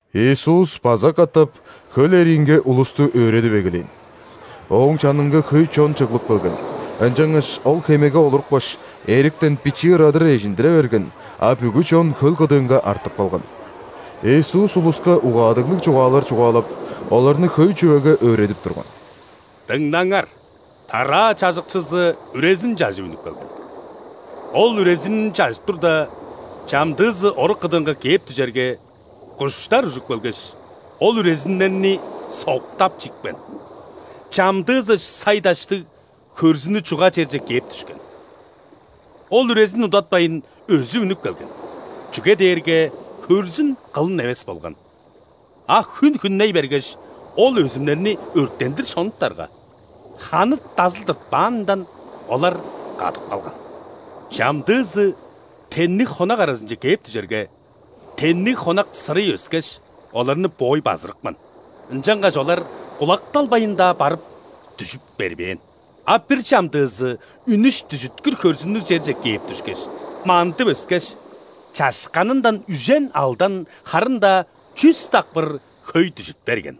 Иисус база катап хөл эриинге улусту өөредип эгелээн. Ооң чанынга хөй чон чыглып келген, ынчангаш Ол хемеге олурупкаш, эриктен бичии ырадыр эжиндире берген, а бүгү чон хөл кыдыынга артып калган. Иисус улуска угаадыглыг чугаалар чугаалап, оларны хөй чүвеге өөредип турган: «Дыңнаңар! Тараа чажыкчызы үрезин чажып үнүп келген. Ол үрезинин чажып турда, чамдыызы орук кыдыынга кээп дүжерге, куштар ужуп келгеш, ол үрезиннерни соктап чипкен. Чамдыызы сай-даштыг, хөрзүнү чуга черже кээп дүшкен. Ол үрезин удатпайн өзүп үнүп келген, чүге дээрге хөрзүн кылын эвес болган. А хүн хүнней бергеш, ол өзүмнерни өрттендир шонуптарга, ханы дазыл тыртпаанындан, олар кадып калган. Чамдыызы тенниг хонак аразынче кээп дүжерге, тенниг хонак сырый өскеш, оларны боой базырыпкан, ынчангаш олар кулакталбайн-даа барып, дүжүт бербээн. А бир чамдыызы үнүш-дүжүткүр хөрзүннүг черже кээп дүшкеш, мандып өскеш, чашканындан үжен, алдан, харын-даа чүс дакпыр хөй дүжүт берген».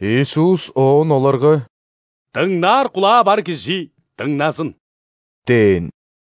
Иисус оон оларга: «Дыңнаар кулаа бар кижи дыңназын!» – дээн.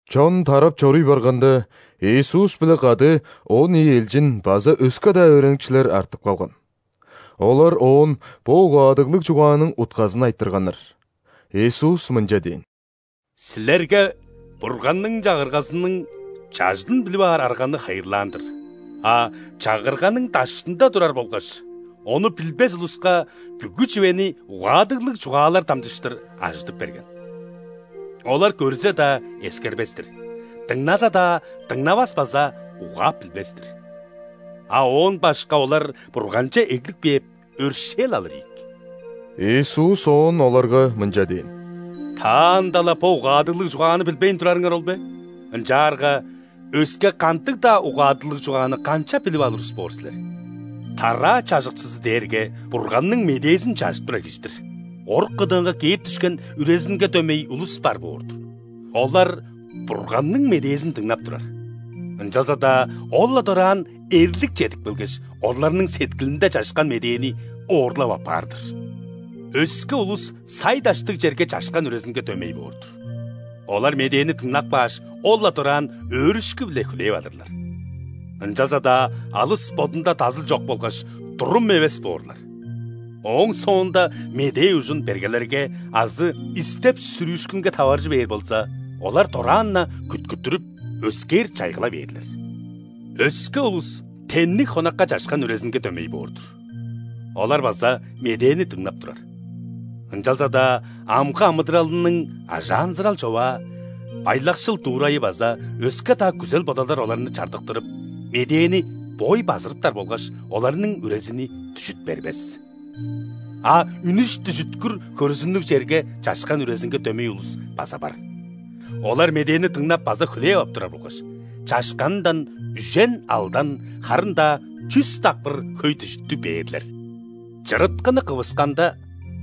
Чон тарап чоруй барганда, Иисус-биле кады он ийи элчин база өске-даа өөреникчилер артып калган. Олар Оон бо угаадыглыг чугааның утказын айтырганнар. Иисус мынча дээн: «Силерге Бурганның Чагыргазының чажыдын билип аар арганы хайырлаан-дыр, а Чагырганың даштында турар болгаш, ону билбес улуска бүгү чүвени угаадыглыг чугаалар дамчыштыр ажыдып берген. Олар көрзе-даа, эскербес-тир,дыңназа-даа, дыңнавас база угаап билбес-тир.А оон башка олар Бурганче эглип кээп, өршээл алыр ийик». Иисус оон оларга мынча дээн: «Таанда-ла бо угаадыглыг чугааны билбейн турарыңар ол бе? Ынчаарга өске кандыг-даа угаадыглыг чугааны канчап билип алыр улус боор силер? Тараа чажыкчызы дээрге Бурганның медээзин чажып турар кижи-дир. Орук кыдыынга кээп дүшкен үрезинге дөмей улус бар боор-дур. Олар Бурганның медээзин дыңнап турар, ынчалза-даа ол-ла дораан эрлик чедип келгеш, оларның сеткилинде чашкан медээни оорлап аппаар-дыр. Өске улус сай-даштыг черге чашкан үрезинге дөмей боор-дур. Олар медээни дыңнап кааш, ол-ла дораан өөрүшкү-биле хүлээп алырлар, ынчалза-даа алыс бодунда дазыл чок болгаш, турум эвес боорлар. Ооң соонда медээ ужун бергелерге азы истеп-сүрүүшкүнге таваржы бээр болза, олар дораан-на күткүттүрүп, өскээр чайгыла бээрлер. Өске улус тенниг хонакка чашкан үрезинге дөмей боор-дур. Олар база медээни дыңнап турар. Ынчалза-даа амгы амыдыралының ажаанзырал-човаа, байлакшыл дуурайы база өске-даа күзел-бодалдар оларны чардыктырып, медээни боой базырыптар болгаш, оларның үрезини дүжүт бербес. А үнүш-дүжүткүр хөрзүннүг черге чашкан үрезинге дөмей улус база бар. Олар медээни дыңнап база хүлээп ап турар болгаш, чашканындан үжен, алдан, харын-даа чүс дакпыр хөй дүжүттү бээрлер». «Чырыткыны кывысканда,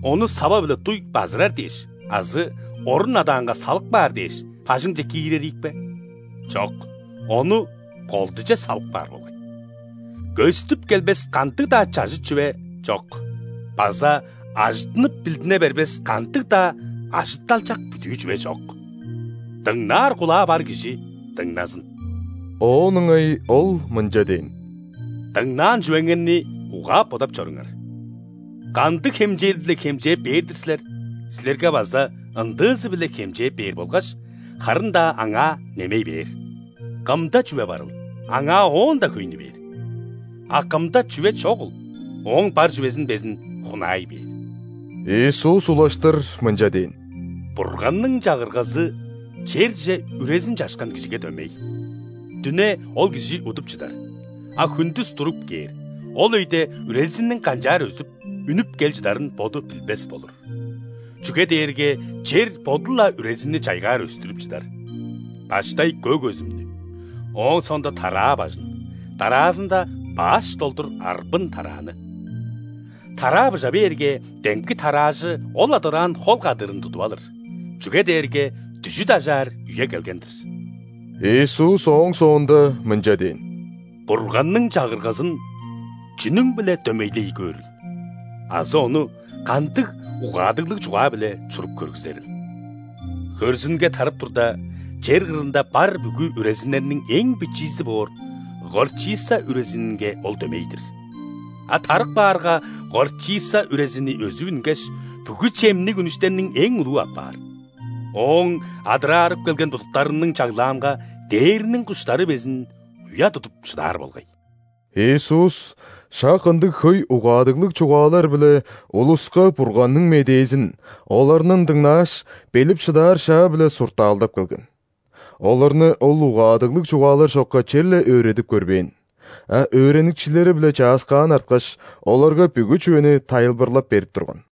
ону сава-биле дуй базырар дээш азы орун адаанга салып каар дээш бажыңче киирер ийик бе? Чок, ону колдуже салып каар болгай. Көстүп келбес кандыг-даа чажыт чүве чок база ажыттынып билдине бербес кандыг-даа ажытталчак бүдүү чүве чок. Дыңнаар кулаа бар кижи дыңназын!» Оон ыңай Ол мынча дээн: «Дыңнаан чүвеңерни угаап-бодап чоруңар. Кандыг хемчээл-биле хемчээп бээр-дир силер, силерге база ындыызы-биле хемчээп бээр болгаш харын-даа аңаа немей бээр. Кымда чүве барыл, аңаа оон-даа хөйнү бээр, а кымда чүве чогул, ооң бар чүвезин безин хунаай бээр». Иисус улаштыр мынча дээн: «Бурганның Чагыргазы черже үрезин чашкан кижиге дөмей. Дүне ол кижи удуп чыдар, а хүндүс туруп кээр, ол өйде үрезинниң канчаар өзүп, үнүп кел чыдарын боду билбес болур. Чүге дээрге чер боду-ла үрезинни чайгаар өстүрүп чыдар: баштай көк өзүмнү, ооң соонда тараа бажын, дараазында баш долдур арбын тарааны. Тараа быжа бээрге, демги тараажы ол-ла дораан хол кадыырын тудуп алыр, чүге дээрге дүжүт ажаар үе келген-дир». Иисус ооң соонда мынча дээн: «Бурганның Чагыргазын чүнүң-биле дөмейлей көөрүл азы ону кандыг угаадыглыг чугаа-биле чуруп көргүзерил? Хөрзүнге тарып турда, чер кырында бар бүгү үрезиннерниң эң бичиизи боор горчица үрезининге ол дөмей-дир. А тарып каарга, горчица үрезини өзүп үнгеш, бүгү чемниг үнүштерниң эң улуу апаар, ооң адырарып келген будуктарының чаглаанга дээрниң куштары безин уя тудуп шыдаар болгай». Иисус шак ындыг хөй угаадыглыг чугаалар-биле улуска Бурганның медээзин, оларның дыңнааш, билип шыдаар шаа-биле, суртаалдап келген. Оларны Ол угаадыглыг чугаалар чокка черле өөредип көрбээн, а өөреникчилери-биле чааскаан арткаш, оларга бүгү чүвени тайылбырлап берип турган.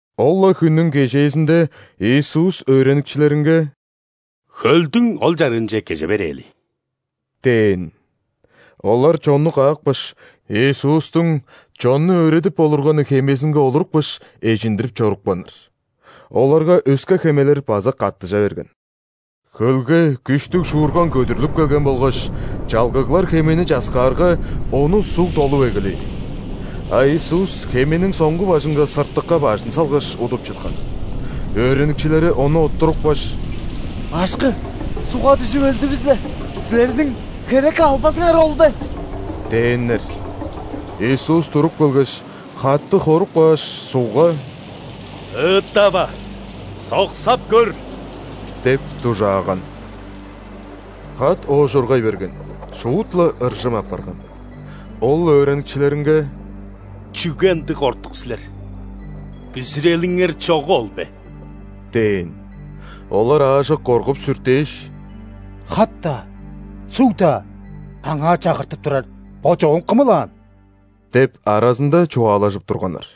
Ол-ла хүннүң кежээзинде Иисус өөреникчилеринге: «Хөлдүң ол чарыынче кеже берээли» – дээн. Олар чонну каапкаш, Иисустуң чонну өөредип олурганы хемезинге олурупкаш, эжиндирип чорупканнар. Оларга өске хемелер база каттыжа берген. Хөлге күштүг шуурган көдүрлүп келген болгаш, чалгыглар хемени часкаарга, ону суг долуп эгелээн. А Иисус хемениң соңгу бажынга, сыртыкка бажын салгаш, удуп чыткан. Өөреникчилери Ону оттурупкаш: «Башкы! Сугга дүжүп өлдүвүс-ле, Силерниң херекке албазыңар ол бе?!» – дээннер. Иисус туруп келгеш, хатты хоруп кааш, сугга: «Ыыттава, соксап көр!» – деп дужааган. Хат оожургай берген, шуут-ла ыржым апарган. Ол өөреникчилеринге: «Чүге ындыг кортук силер? Бүзүрелиңер чогу ол бе?» – дээн. Олар аажок коргуп-сүртээш: «Хат-даа, суг-даа Аңаа чагыртып турар, бо чогум Кымыл аан?» – деп аразында чугаалажып турганнар.